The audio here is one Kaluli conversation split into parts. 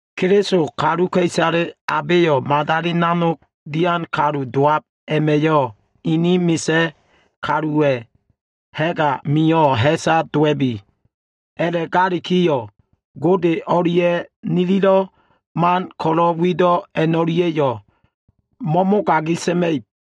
Keliso kaluka꞉isale abeyo꞉ madali nanog dian kalu dowab a꞉ma꞉yo꞉ inin bo꞉fo꞉lowan kaluwa꞉ ha꞉g amio꞉ ha꞉sa dowa꞉bi. A꞉la꞉galikiyo꞉, Godeya꞉ wi o꞉lia꞉ nililo꞉ man ko꞉lo꞉ wido꞉ a꞉no꞉lia꞉yo꞉ mo꞉mogagi sa꞉ma꞉ib.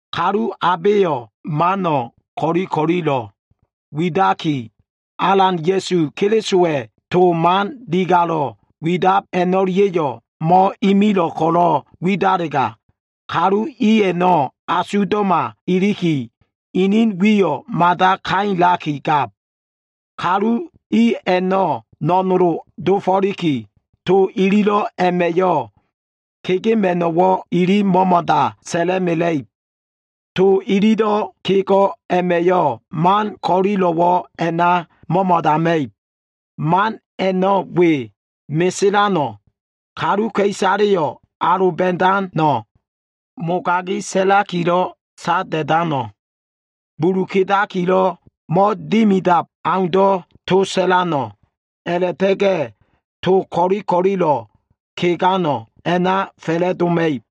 Kalu abeyo꞉ mano꞉ ko꞉li ko꞉lilo꞉ widaki, Alan Ya꞉su Kelisowa꞉ to man digalo꞉ widab a꞉no꞉lia꞉yo꞉ mo꞉imilo꞉ ko꞉lo꞉ widalega, kalu i a꞉no꞉ asugdo꞉ma iliki, inin wiyo꞉ mada kailaki gab. Kalu i a꞉no꞉ no꞉nolo꞉ dofo꞉liki, to ililo꞉ a꞉ma꞉yo꞉ kegema꞉no꞉wo꞉ ili mo꞉mo꞉da sa꞉la꞉mela꞉ib. To ililo꞉ kego꞉ a꞉ma꞉yo꞉ man ko꞉lilo꞉wo꞉ a꞉na mo꞉mo꞉dama꞉ib. Man a꞉no꞉ we, meselano꞉, kaluka꞉isaleyo꞉ aloba꞉dano꞉, mogagi sa꞉lakilo꞉ sada꞉dano꞉, bulu kedakilo꞉ mo꞉dimidab aundo꞉ to sa꞉lano꞉, a꞉la꞉ta꞉ga꞉ to ko꞉li ko꞉lilo꞉ kegano꞉ a꞉na fa꞉la꞉doma꞉ib.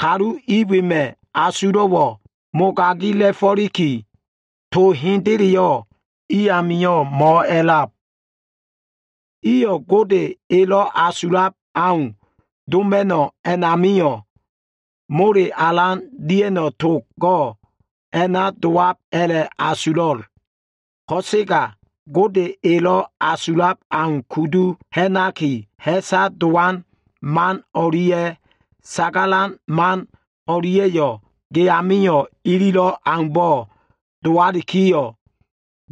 Kalu i wema꞉ asulo꞉wo꞉ mogagila꞉fo꞉liki, to hendeleyo꞉ i amio꞉ mo꞉a꞉lab. Iyo꞉ Gode elo꞉ asulab au doma꞉no꞉ a꞉namio꞉, mole alan dia꞉no꞉ togo꞉ a꞉na dowab a꞉la꞉asulo꞉. Ko꞉sega Gode elo꞉ asulab au kudu ha꞉naki, ha꞉sa dowan man o꞉lia꞉ sagalan man o꞉lia꞉yo꞉ ge amio꞉ ililo꞉ aumbo꞉ dowalikiyo꞉,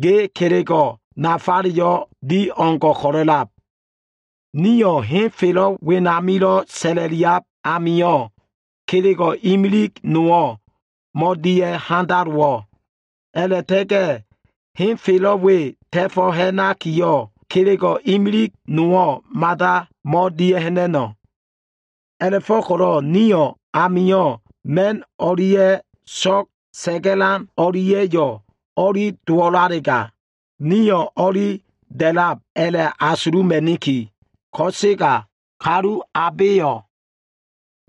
ge kelego꞉ nafaleyo꞉ di o꞉ngo꞉ ko꞉lo꞉lab. Nio꞉ henfelo꞉ wenamilo꞉ sa꞉la꞉liab amio꞉ kelego꞉ imilig nowo꞉ mo꞉dia꞉ handalowo꞉. A꞉la꞉ta꞉ga꞉ henfelo꞉ we ta꞉fo꞉ ha꞉nakiyo꞉, kelego꞉ imilig nowo꞉ mada mo꞉dia꞉ha꞉na꞉no꞉. A꞉la꞉fo꞉ko꞉lo꞉ ni amio꞉ ma꞉n o꞉lia꞉ so꞉g sa꞉ga꞉lan o꞉lia꞉ a꞉no꞉ o꞉li dowo꞉lalega, nio꞉ o꞉li da꞉lab a꞉la꞉asuluma꞉niki. Ko꞉sega, kalu abeyo꞉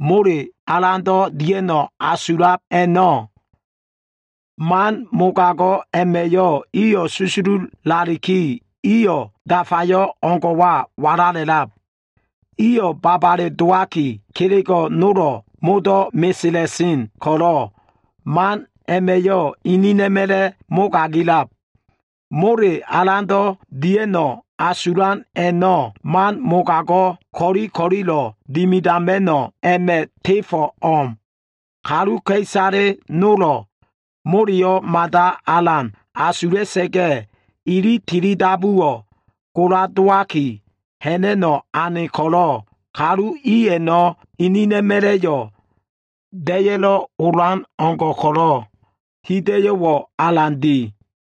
mole alando꞉ dia꞉no꞉ asulab i a꞉no꞉, man mogago꞉ a꞉ma꞉yo꞉ iyo꞉ susululaliki, iyo꞉ dafayo꞉ o꞉ngo꞉wa walala꞉lab. Iyo꞉ babale dowaki, kelego꞉ nolo꞉ modo꞉ mesela꞉sen ko꞉lo꞉, man a꞉ma꞉yo꞉ inina꞉ma꞉la꞉ mogagilab. Mole alando꞉ dia꞉no꞉ asulan a꞉no꞉, man mogago꞉ ko꞉li ko꞉lilo꞉ dimidama꞉no꞉ a꞉ma꞉ tefo꞉ o꞉m. Kaluka꞉isale nolo꞉ moleyo꞉ mada alan asula꞉sa꞉ga꞉, ili tilidabuwo꞉ gola dowaki, ha꞉na꞉no꞉ ane ko꞉lo꞉, kalu i a꞉no꞉ inina꞉ma꞉la꞉yo꞉ da꞉ya꞉lo꞉ olan o꞉ngo꞉ ko꞉lo꞉ hida꞉yo꞉wo꞉ alan di.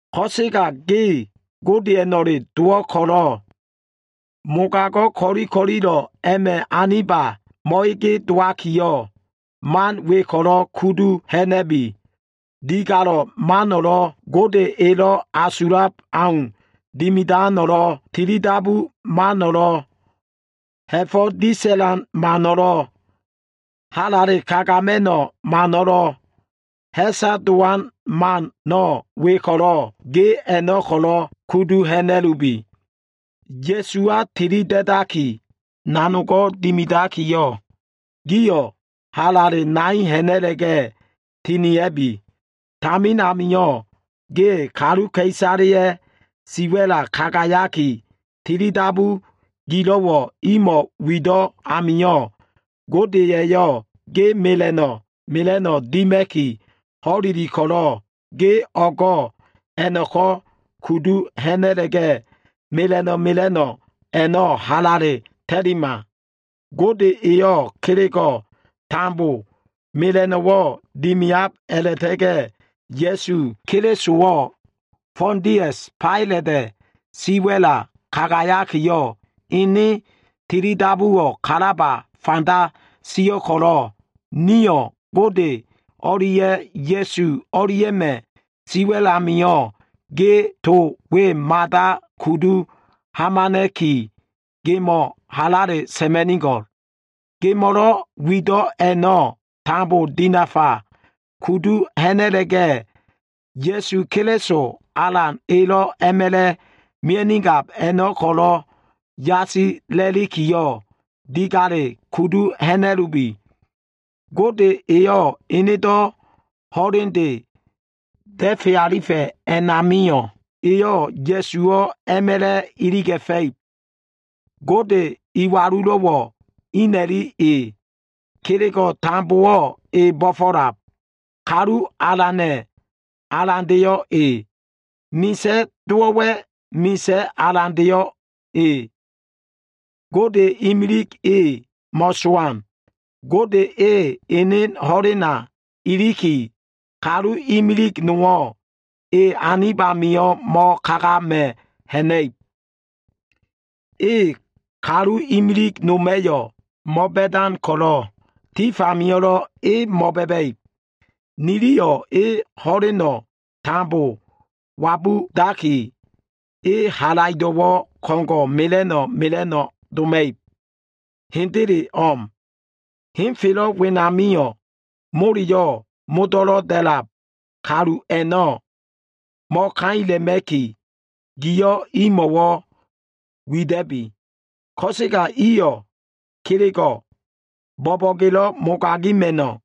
Ko꞉sega ge Godeya꞉no꞉le dowo꞉ ko꞉lo꞉, mogago꞉ ko꞉li ko꞉lilo꞉ a꞉ma꞉ anib amio꞉ mo꞉ege dowakiyo꞉, man we ko꞉lo꞉ kudu ha꞉na꞉bi. Digalo꞉ mano꞉lo꞉, Gode elo꞉ asulab au dimidano꞉lo꞉, tilidabu mano꞉lo꞉, ha꞉fo꞉ disa꞉lan mano꞉lo꞉, halale kagama꞉no꞉ mano꞉lo꞉, ha꞉sa dowan mano꞉ we ko꞉lo꞉, ge a꞉no꞉ kudu ha꞉na꞉lubi. Ya꞉suwa tilida꞉daki, nanogo꞉ dimidakiyo꞉, giyo꞉ halale nai ha꞉na꞉la꞉ga꞉ tinia꞉bi. Tamin amio꞉ ge kaluka꞉isaleya꞉ siwa꞉la kagayaki, tilidabu gilo꞉wo꞉ imo꞉ wido꞉ amio꞉, Gode eyo꞉ ge mela꞉no꞉ mela꞉no꞉wo꞉ dima꞉ki ho꞉leli ko꞉lo꞉, ge o꞉go꞉ a꞉no꞉ko꞉ kudu ha꞉na꞉la꞉ga꞉, mela꞉no꞉ mela꞉no꞉ a꞉no꞉ halale ta꞉lima. Gode eyo꞉ kelego꞉ tambo mela꞉no꞉wo꞉ dimiab a꞉la꞉ta꞉ga꞉ Ya꞉su Kelisowo꞉ Fondias Failata꞉ siwa꞉la kagayakiyo꞉, ene tilidabuwo꞉ kalaba fanda sio꞉ ko꞉lo꞉, niyo꞉ Gode o꞉lia꞉ Ya꞉su o꞉lia꞉ma꞉ siwa꞉l amio꞉ ge to we kudu hamana꞉ki gemo꞉ halale sa꞉ma꞉nigo꞉l. Gemo꞉lo꞉ wido꞉ a꞉no꞉ tambo dinafa kudu ha꞉na꞉la꞉ga꞉, Ya꞉su Keliso Alan elo꞉ a꞉ma꞉la꞉ mia꞉nigab a꞉no꞉ ko꞉lo꞉ yasila꞉likiyo꞉, digale kudu ha꞉na꞉lubi. Gode eyo꞉ enedo꞉ ho꞉lende da꞉fe alifa꞉ a꞉namio꞉, Eyo꞉ Ya꞉suwo꞉ a꞉ma꞉la꞉ iliga꞉fa꞉ib. Gode iwalulo꞉wo꞉ ina꞉li e, Kelego꞉ tambowo꞉ e bo꞉fo꞉lab. Kalu Alana꞉, Alandeyo꞉ E, Misa꞉ dowo꞉wa꞉, Misa꞉ Alandeyo꞉ E. Gode imilig e mo꞉sowan. Gode e ene ho꞉lena iliki, kalu imilig nowo꞉ e anib amio꞉ mo꞉kagama꞉ ha꞉na꞉ib. E kalu imilig noma꞉yo꞉ mo꞉ba꞉dan ko꞉lo꞉, tif amio꞉lo꞉ e mo꞉ba꞉ba꞉ib. Niliyo꞉ e ho꞉leno꞉ tambo wabudaki, Ene halaido꞉wo꞉ ko꞉ngo꞉ mela꞉no꞉ mela꞉no꞉ doma꞉ib. Hendele o꞉m. Henfelo꞉ wenamio꞉ moleyo꞉ modo꞉lo꞉ da꞉lab kalu a꞉no꞉ mo꞉kaila꞉ma꞉ki, giyo꞉ imo꞉wo꞉ wida꞉bi. Ko꞉sega iyo꞉ kelego꞉ bo꞉bo꞉gelo꞉ mogagima꞉no꞉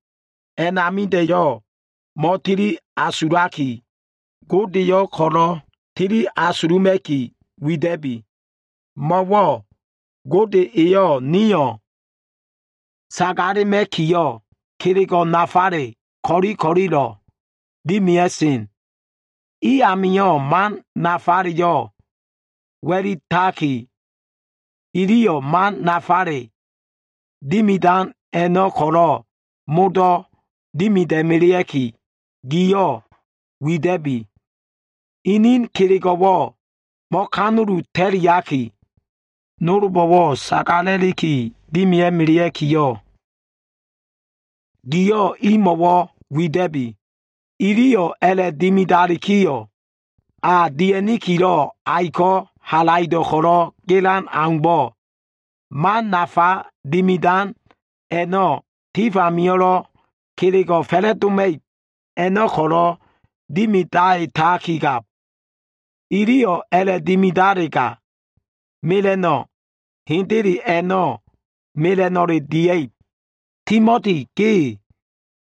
a꞉namida꞉yo꞉ mo꞉tili asulaki, Godeyo꞉ ko꞉lo꞉ tili asuluma꞉ki wida꞉bi. Mo꞉wo꞉ Gode eyo꞉ nio꞉ sagalema꞉kiyo꞉, kelego꞉ nafale ko꞉li ko꞉lilo꞉ dimia꞉sen. I amio꞉ man nafaleyo꞉ wa꞉litaki, iliyo꞉ man nafale dimidan a꞉no꞉ ko꞉lo꞉ modo꞉ dimida꞉melea꞉ki, giyo꞉ wida꞉bi. Inin kelego꞉wo꞉ mo꞉kanulu ta꞉liaki, nolbo꞉wo꞉ sagala꞉liki dimia꞉melea꞉kiyo꞉, giyo꞉ imo꞉wo꞉ wida꞉bi. Iliyo꞉ a꞉la꞉dimidalikiyo꞉, a dia꞉nikilo꞉ aiko꞉ halaido꞉ ko꞉lo꞉ gelan aumbo꞉, man nafa dimidan a꞉no꞉ tif amio꞉lo꞉ kelego꞉ fa꞉la꞉doma꞉ib a꞉no꞉ ko꞉lo꞉ dimidaitakigab. Iliyo꞉ a꞉la꞉dimidalega, mela꞉no꞉ hendele a꞉no꞉ mela꞉no꞉le dia꞉ib. Timoti, ge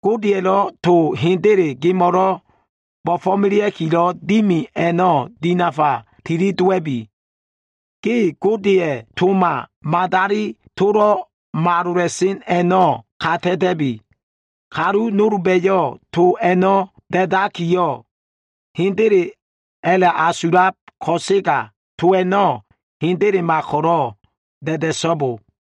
Godeya꞉lo꞉ to hendele gemo꞉lo꞉ bo꞉fo꞉melea꞉kilo꞉ dimi a꞉no꞉ dinafa tili dowa꞉bi. Ge Godeya꞉ toma, madali tolo꞉ malola꞉sen a꞉no꞉ ka ta꞉ta꞉bi. Kalu nolba꞉yo꞉ to a꞉no꞉ da꞉dakiyo꞉, “Hendele” a꞉la꞉asulab ko꞉sega, to a꞉no꞉ hendelema ko꞉lo꞉ da꞉da꞉so꞉bo.